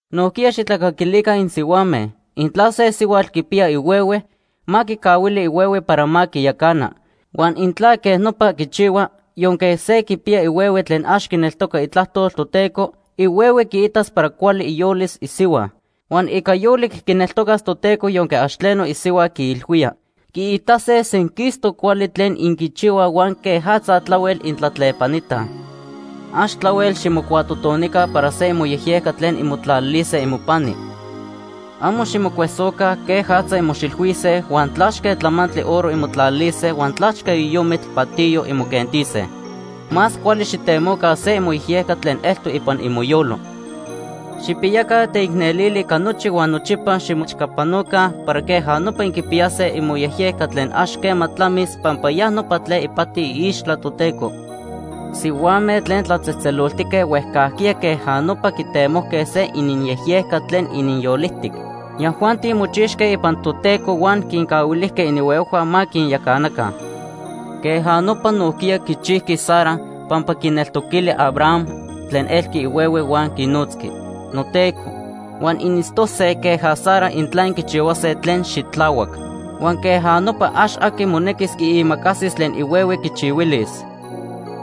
Nojquiya xijtlacaquilica insihuame. Intla se sihuatl quipiya ihuehue, ma quicahuili ihuehue para ma quiyacana. Huan intla quej nopa quichihua, yonque se quipiya ihuehue tlen ax quineltoca itlajtol Toteco, ihuehue quiitas para cuali iyolis isihua, huan ica yolic quineltocas Toteco yonque ax tleno isihua quiilhuía. Quiitase senquistoc cuali tlen inquichihuaj huan quejatza tlahuel intlatlepanitaj. Ax tlahuel ximocuatotonica para se imoyejyejca tlen inmotlalilise imopani. Amo ximocuesoca quejatza inmoxilhuise, huan tlachque tlamantli oro inmotlalilise huan tlachque yoyomitl patiyo inmoquentise. Más cuali xijtemoca se imoyejyejca tlen eltoc ipan imoyolo. Xijpiyaca teicnelili ica nochi huan nochipa ximoechcapanoca para queja nopa inquipiyase imoyejyejca tlen ax quema tlamis, pampa ya nopa tlen ipati iixtla Toteco. Sihuame tlen tlatzejtzeloltique huejcajquiya queja nopa quitemojque se ininyejyejca tlen ininyolijtic. Yajuanti mochixque ipan Toteco huan quincahuilijque ininhuehuejhua ma quinyacanaca. Queja nopa nojquiya quichijqui Sara, pampa quineltoquili Abraham tlen elqui ihuehue huan quinotzqui “noteco”. Huan initztose queja Sara intla inquichihuase tlen xitlahuac. Huan queja nopa ax aqui monequis quiimacasis tlen ihuehue quichihuilis.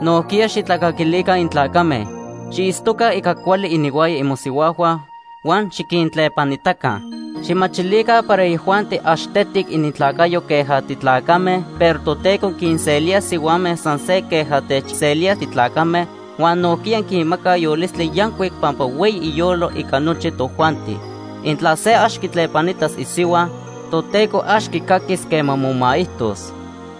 Nojquiya xijtlacaquilica intlacame. Xiitztoca ica cuali ininhuaya imosihuajhua huan xiquintlepanitaca. Xijmachilica para yajuanti ax tetic inintlacayo queja titlacame, pero Toteco quinselía sihuame san se queja techselía titlacame huan nojquiya quinmaca yolistli yancuic pampa hueyi iyolo ica nochi tojuanti. Intla se ax quitlepanitas isihua, Toteco ax quicaquis quema momaijtos.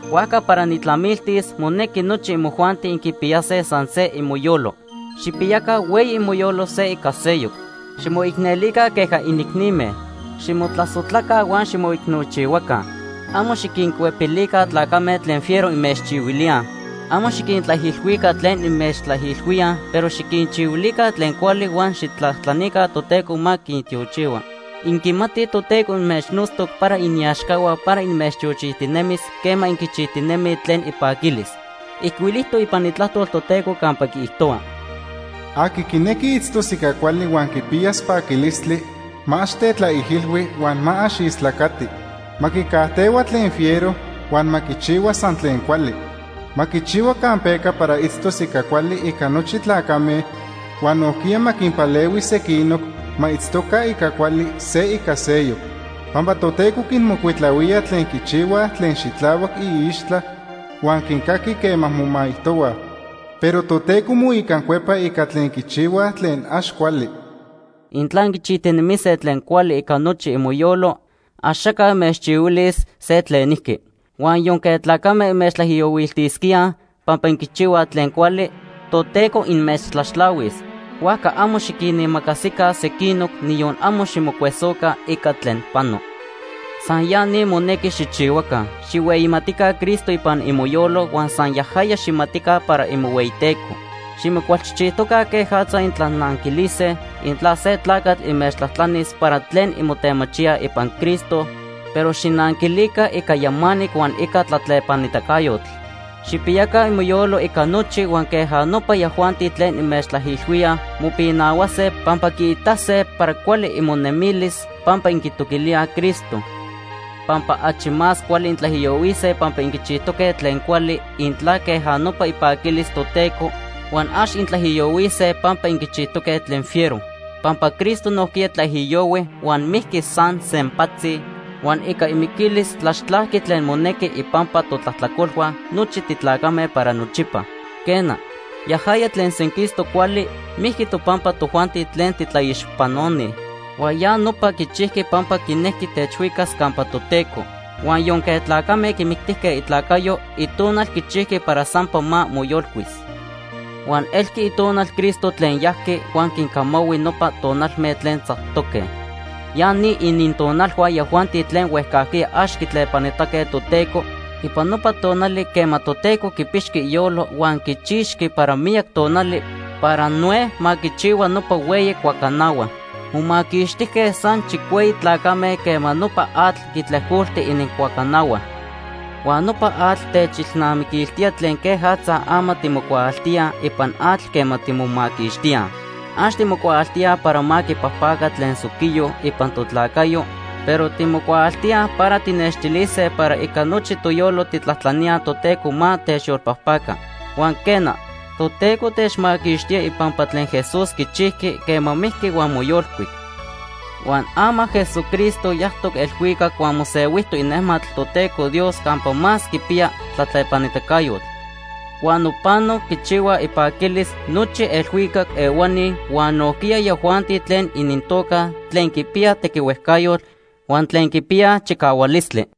Huajca para nijtlamiltis, monequi nochi imojuanti inquipiyase san se imoyolo. Xijpiyaca hueyi imoyolo se ica seyoc. Ximoicnelica queja inicnime. Ximotlasojtlaca huan ximoicnochihuaca. Amo xiquincuepilica tlacame tlen fiero inmechchihuilíaj. Amo xiquintlaijilhuica tlen inmechtlaijilhuíaj, pero xiquinchihuilica tlen cuali huan xijtlajtlanica Toteco ma quintiochihua. Inquimatij Toteco inmechnotztoc para iniaxcahua para inmechtiochijtinemis quema inquichijtinemij tlen ipaquilis. Ijcuilijtoc ipan Itlajtol Toteco campa quiijtohua: “Aqui quinequi itztos ica cuali huan quipiyas paquilistli ma ax tetlaijilhui huan ma ax istlacati. Ma quicajtehua tlen fiero huan ma quichihua san tlen cuali. Ma quichihua campeca para itztos ica cuali ica nochi tlacame, huan nojquiya ma quinpalehui sequinoc ma itztoca ica cuali se ica seyoc. Pampa Toteco quinmocuitlahuía tlen quichihuaj tlen xitlahuac iixtla, huan quincaqui quema momaijtohuaj. Pero Toteco moicancuepa ica tlen quichihuaj tlen ax cuali.” Intla inquichijtinemise tlen cuali ica nochi imoyolo, Axaca inmechchihuilis se tlenijqui. Huan yonque tlacame inmechtlaijiyohuiltisquíaj pampa inquichihuaj tlen cuali, Toteco inmechtlaxtlahuis. Huajca amo xiquinimacasica sequinoc, niyon amo ximocuesoca ica tlen pano. San ya ni monequi xijchihuaca. Xijhueyimatica Cristo ipan imoyolo huan san yajaya xijmatica para imohueyiTeco. Ximocualchijchijtoca quejatza intlananquilise intla se tlacatl inmechtlajtlanis para tlen inmotemachíaj ipan Cristo, pero xijnanquilica ica yamanic huan ica tlatlepanitacayotl. Xijpiyaca imoyolo ica nochi, huan queja nopa yajuanti tlen inmechtlaijilhuíaj mopinahuase, pampa quiitase para cuali imonemilis pampa inquitoquilíaj Cristo. Pampa achi más cuali intlaijiyohuise pampa inquichijtoque tlen cuali, intla queja nopa ipaquilis Toteco, huan ax intlaijiyohuise pampa inquichijtoque tlen fiero. Pampa Cristo nojquiya tlaijiyohui huan mijqui san sempatzi, huan ica imiquilis tlaxtlajqui tlen monejqui ipampa totlajtlacolhua nochi titlacame para nochipa. Quena, yajaya tlen senquistoc cuali mijqui topampa tojuanti tlen titlaixpanoni, huan ya nopa quichijqui pampa quinejqui techhuicas campa Toteco. Huan yonque tlacame quimictijque itlacayo, itonal quichijqui para sampa ma moyolcuis. Huan elqui itonal Cristo tlen yajqui huan quincamahui nopa tonalme tlen tzactoque. Ya ni inintonalhua yajuanti tlen huejcajquiya ax quitlepanitaque Toteco ipan nopa tonali quema Toteco quipixqui iyolo huan quichixqui para miyac tonali para Noé ma quichihua nopa hueyi cuacanahua. Momaquixtijque san chicueyi tlacame quema nopa atl quitlejcolti inincuacanahua. Huan nopa atl techilnamiquiltía tlen quejatza ama timocuaaltíaj ipan atl quema timomaquixtíaj. Ax timocuaaltíaj para ma quipajpaca tlen soquiyo ipan totlacayo, pero timocuaaltíaj para tijnextilise para ica nochi toyolo tijtlajtlaníaj Toteco ma techyolpajpaca. Huan quena, Toteco techmaquixtía ipampa tlen Jesús quichijqui quema mijqui huan moyolcuic. Huan ama Jesucristo yajtoc elhuicac huan mosehuijtoc inejmatl Toteco Dios campa más quipiya tlatlepanitacayotl. Huan nopano quichihuaj ipaquilis nochi elhuicac ehuani huan nojquiya yajuanti tlen inintoca tlen quipiyaj tequihuejcayotl huan tlen quipiyaj chicahualistli.